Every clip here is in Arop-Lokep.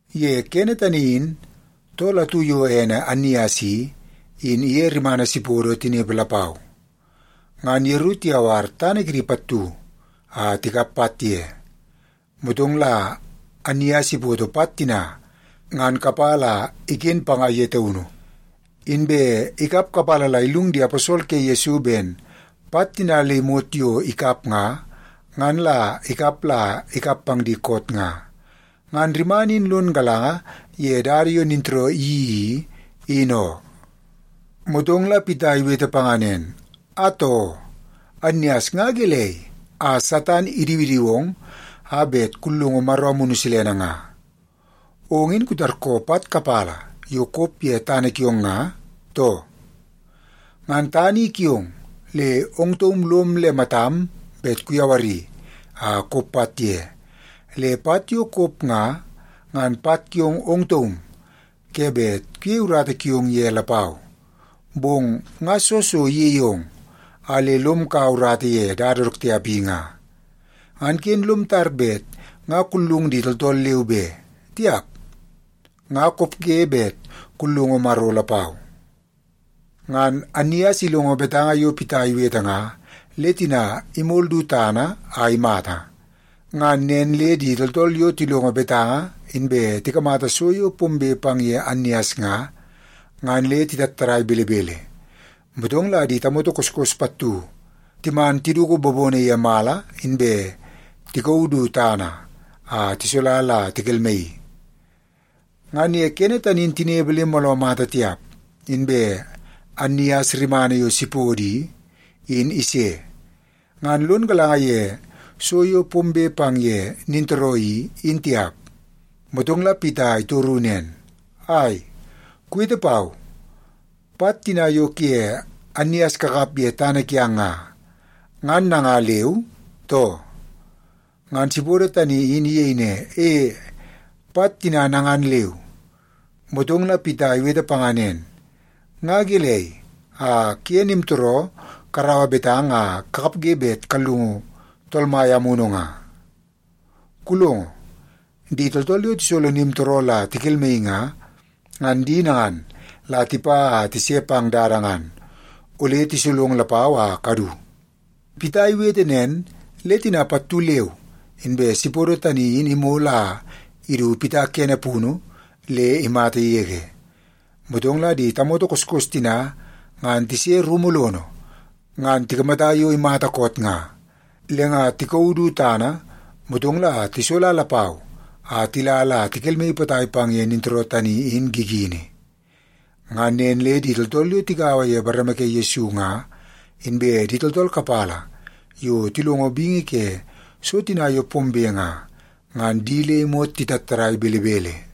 Ye kene tani in, tool atu yo ene Annias i, in iye rimana Sipodo tinepe lapau. Ngan yeru tiyawar tana kidi pattu a tikap pat ye. Motong la Annias ipoto pat tina ngan kapala a iken panga ye taunu, inbe ikap kapala la illung di aposol ke Yesu ben pat tina le imot yo ikap nga, ngan la ikap la ikap pang di koot nga. Ngan rimana in lon galanga ye dada yo nintooroo iyeii i, in oo. Motong la Pita iwete panga nen, “Atoo, Annias nga gelei a Satan idiwidiwong a bet kullungu Maro Amunu Silene nga? Ong in kutarkoo pat kapala yo kop ye tana kiong nga, too? Ngan tana in kiong, le ong taum lom le matam bet kuyawari a kop pat ye. Le pat yo kop nga, ngan pat kiong ong taum ke bet kuyei urata kiong ye lapau. Bong nga soo so iyeie ong a le lom kaua urata ye dada dook tiap i nga? Ngan ken lom tar bet nga kullung di tooltool leu be. Tiap, nga kopge bet kullungu Maro lapau.” Ngan Annias ilongo betanga yo Pita iwete nga, le tina imol du tana a imata. Ngan nen le di tooltool yo tilongo betanga, inbe tikamata so yo pombe pang ye Annias nga, ngan le titattadai belebele. Motong la di tamoto koskos pattu timan tiduku bobono ye mala, inbe tikauu du tana a tisola la tikelmaii. Ngan ye kene tani in tinepe le mooloo mata tiap, inbe Annias rimana yo Sipodo i, in ise. Ngan lon galanga ye so yo pombe pang ye nintooroo i, in tiap. Motong la Pita itoru nen, “Ai, kuwete pau. Pat tina yo kuye Annias kakap ye tana kiang nga, ngan nanga leu, too?” Ngan Sipodo tani in iyei ne, “E, pat tina nangan leu.” Motong la Pita iwete panga nen, “Nga gelei a kuye nimtooroo karaua betanga a kakapge bet kallungu Tool Mai Amunu nga? Kulongo, di tooltool yo tisolo nimtooroo la tikelmaii nga, ngan di nangan la tipa a tise pang dada ngan. Ole tisolong lapau a kadu.” Pita iwete nen, le tina pattu leu inbe Sipodo tani in imol a idu Pita kene punu, le imata yege. Motong la di tamoto koskos tina ngan tise rumu lono, ngan tikamata yo imata koot nga. Le nga tikauu du tana, motong la tisola lapau a tila la tikelmaii potai pang ye nintooroo tani in gigini. Ngan nen le di tooltool yo tigaua ye bareme ke Yesu nga, inbe di tooltool kapala yo tilongo bingi ke so tina yo pombe nga, ngan di le imot titattadai belebele.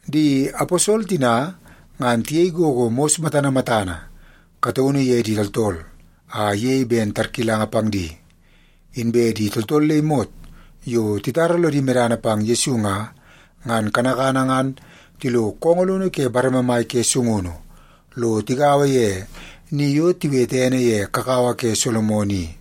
Di aposol tina, ngan tiyei gogo mos matana matana kataunu ye di tooltool, a iyei ben tarkilanga pang di. Inbe di tooltool le imot yo titara lodi medana pang Yesu nga, ngan kanakana ngan tilo koongoo lono ke bareme mai ke sungunu, lo tigaua ye ni yo tiwete ene ye Kakawa ke Solomon i.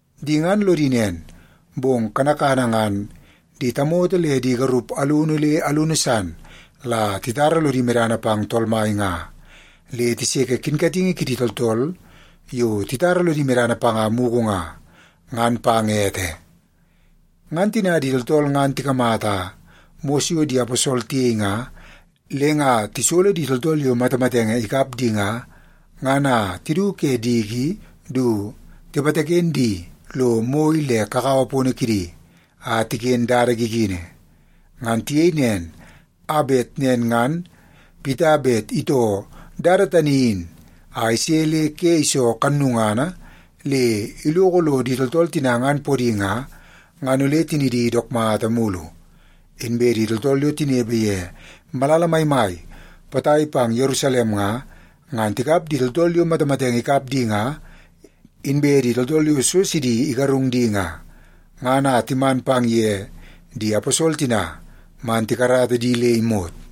Di ngan lodi nen, bong kanakana ngan di tamoto le di garup alunu le alunu san la titara lodi medana pang Tool Mai nga, le tiseke kinkatingi kidi tooltool yo titara lodi medana panga mugu nga, ngan pang ete. Ngan tina di tooltool ngan tikamata mos yo di aposol tiyei nga, le nga tisolo di tooltool yo matamatenge ikap di nga, ngan a tidu ke diki du tipataken di lo moi le kakawa pono kidi, a tiken dada gigini. Ngan tiyei nen a bet nen ngan Pita bet itoo dada tani in a ise le ke iso kannungana le iloko lo di tooltool tina ngan podi nga, ngan ole tinidi dook mata mulu. Inbe di tooltool yo tinepe ye malala maimai potai pang ye Yerusalem nga, ngan tikap di tooltool yo matamatenge ikap di nga, inbe di tooltool yo so sidi igarung di nga, ngan a timan pang ye di aposol tina man tikarata di le imot.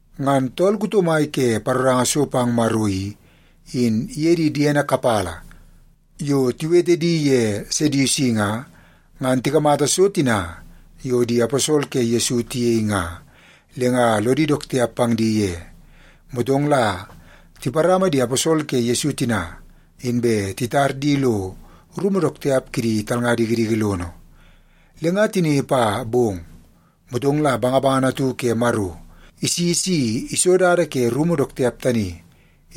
Ngan tool kuto mai ke paroranga so pang Maro i, in iye di diene kapala yo tiwete di ye Sedusi nga, ngan tikamata so tina yo di aposol ke Yesu tiyei nga, le nga lodi dook tiap pang di ye. Motong la tiparama di aposol ke Yesu tina, inbe titar di lo rumu dook tiap kidi talnga dikidiki lono. Le nga tinepe a bong, motong la bangabangana atu ke Maro isi si iso dada ke rumu dook tiap tani,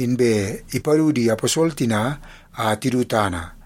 inbe ipadu di aposol tina a tidu tana.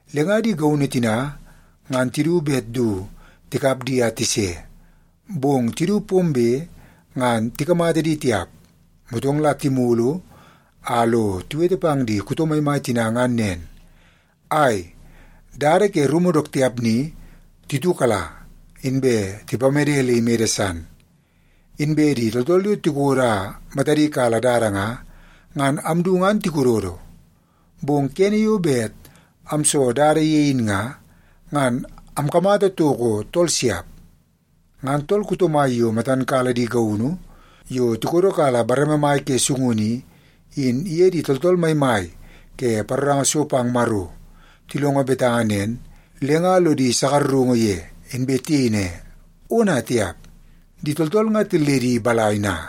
Le nga di gaunu tina ngan tidu bet du tikap di a tise, bong tidu pombe ngan tikamata di tiap. Motong la timulu a lo tiwete pang di kuto maimai tina ngan nen, “Ai, dada ke rumu dook tiap ni titiukala, inbe tipamede le imede san. Inbe di tooltool yo tikodo a matadi kala dada nga, ngan amdu ngan tikododo. Bong kene yo bet amso dada ye in nga, ngan amkamata toko tooltool siap.” Ngan tool kuto mai yo matan kala di gaunu yo tikodo kala bareme mai ke sungunu i, in iye di tooltool maimai ke paroranga so pang Maro tilongo betanga nen, le nga lodi sakarungu ye, inbe tiyei ne, “Ona tiap! Di tooltool nga tilledi balai na?”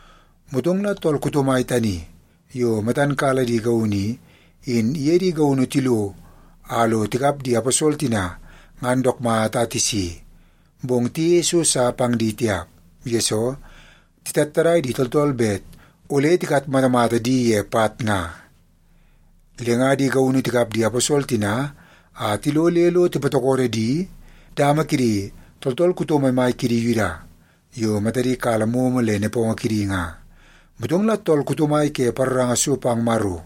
Motong la tool kuto mai tani yo matan kala di gaunu i, in iye di gaunu tilo a lo tikap di aposol tina ngan dook mata a tisi. Bong tiyeie so sa pang di tiap, yesoo titattadai di tooltool bet ole tikatmatamata di ye pat nga. Le nga di gaunu tikap di aposol tina a tilo le lo tipatokodo di dama kidi tooltool kuto maimai kidi Yuda yo matadi kala momo le nepongo kidi nga. Motong la tool kuto mai ke paroranga so pang Maro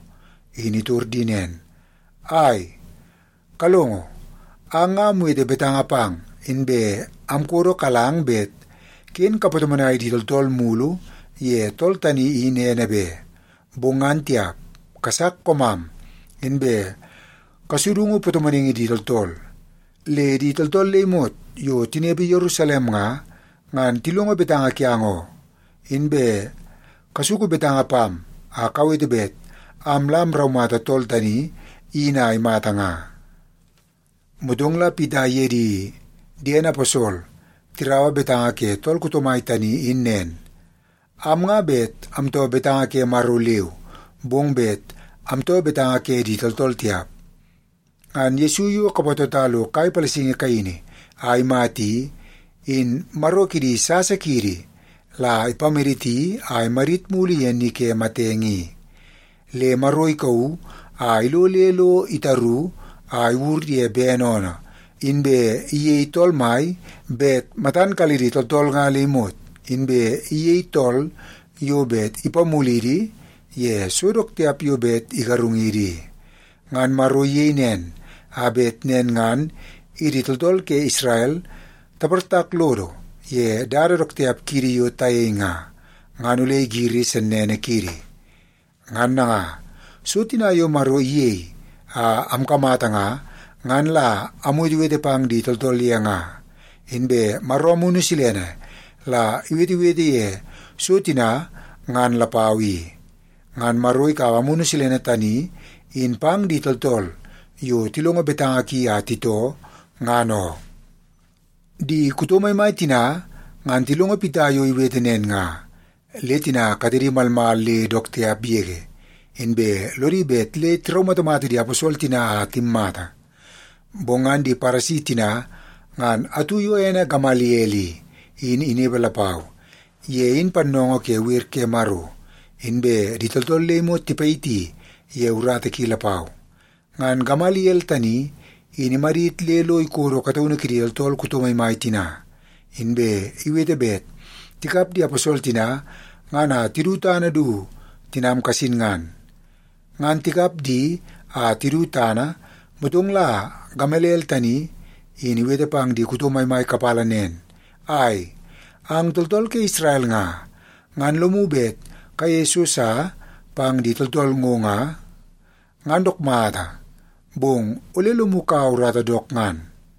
in itor di nen, “Ai! Kalongo, ang nga amwete betanga pang, inbe amkodokalang bet ken kapatomonai di tooltool mulu ye tool tani in ene be. Bong ngan tiap, kasak koomam, inbe kasudungu patomonaingi di tooltool. Le di tooltool le imot yo tinepe Yerusalem nga, ngan tilongo betanga kiang oo. Inbe kasuku betanga pam a kawete bet am la amraumata tool tani in a imata nga.” Motong la Pita iye di diene aposol tiraua betanga ke tool kuto mai tani in nen, “Am nga bet amtoo betanga ke Maro leu, bong bet amtoo betanga ke di tooltool tiap. Ngan Yesu yo kapatota lo kai palasingi kaini a imata i, in Maro kidi sasa kiidi la ipamaditi a imadit mulu ye ni ke matenge i. Le Maro ikauu a ilo le lo itaru a iwur ye bene oonoo, inbe iyei tool mai bet matan kalidi tooltool nga le imot, inbe iyei tool yo bet ipamulidi ye so dook tiap yo bet igarungidi i. Ngan Maro iyei nen, a bet nen ngan idi tooltool ke Isrel taportak lodo ye dada dook tiap kiidi yo tayei nga, ngan ole igiri sennene kiidi. Ngan nanga, so tina yo Maro iyei a amkamata nga, ngan la amwetewete pang di tooltool ye nga. Inbe Maro Amunu Silene la iwetewete ye so tina ngan lapau i. Ngan Maro ikaua Amunu Silene tani in pang di tooltool yo tilongo betanga ki a titoo, ngan oo.” Di kuto maimai tina ngan tilongo Pita yo iwete nen nga, le tina katedi malmal le dook tiap yege, inbe lodi bet le tiraumatamata di aposol tina a timmata. Bong ngan di Paresi tina ngan atu yo ene Gamaliel i, in inepe lapau. Ye in pannoongoo ke wer ke Maro, inbe di tooltool le imot tipayiti ye urata ki lapau. Ngan Gamaliel tani, in imadit le lo ikodo kataunu kidi tooltool kuto maimai tina, inbe iwete bet tikap di aposol tina ngan a tidu tana du tinam kasin ngan. Ngan tikap di a tidu tana, motong la Gamaliel tani in iwete pang di kuto maimai kapala nen, “Ai, ang tooltool ke Isrel nga, ngan lomu bet kayeie so sa pang di tooltool ngo nga, ngan dook mata, bong ole lomu kaua urata dook ngan.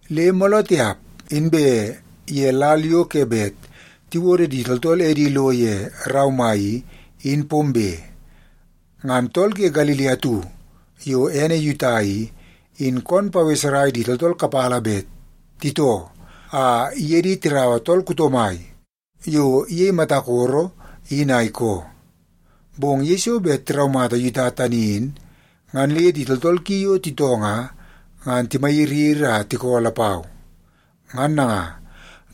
Le mooloo tiap, inbe ye lal yo ke bet tiwodo di tooltool edi lo ye rau mai i, in pombe, ngan tool ke Galili atu yo ene Yuta i, in koon paweserai di tooltool kapala bet titoo a iye di tiraua tool kuto mai yo iyei mata koro in a ikoo. Bong yeiso bet tiraumata Yuta tani in, ngan le di tooltool ki yo titoo nga, ngan timayiriyiri a tikoo lapau. Ngan nanga,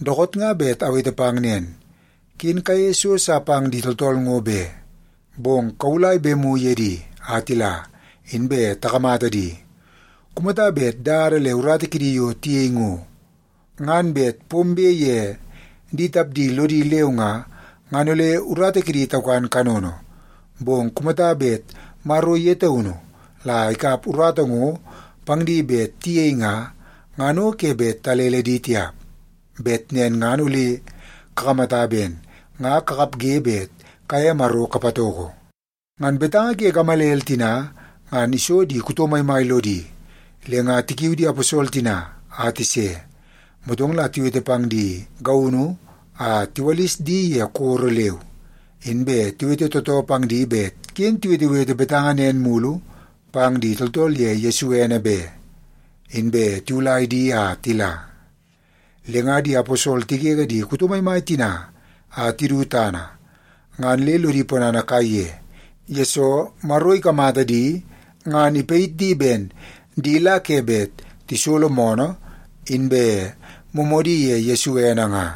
dookoot nga bet awete pang nen, ken kayeie so sa pang di tooltool ngo be. Bong kawulai bemu ye di a tila, inbe takamata di. Kumata bet dada le urata kidi yo tiyei ngo, ngan bet pombe ye di tapdi lodi leu nga, ngan ole urata kidi taukan kanono. Bong kumata bet Maro ye taunu la ikap urata ngo pang bet tiyei nga, ngan o ke bet kalele di tiap. Bet nen ngan ole kakamata ben nga kakapge bet kaye Maro kapatoko.” Ngan betanga ke Gamaliel tina ngan iso di kuto maimai lodi, le nga tikiu di aposol tina a tise. Motong la tiwete pang di gaunu a tiwalis di ye koro leu. Inbe tiwete tootoo pang di bet ken tiwetewete betanga nen mulu pang di tooltool ye Yesu ene be, inbe tiwulai di a tila. Le nga di aposol tigege di kuto maimai tina a tidu tana, ngan le lodi ponana kaiye, yesoo Maro ikamata di ngan ipayit di ben di la ke bet tisolo moonoo nen ye Yesu ene nga.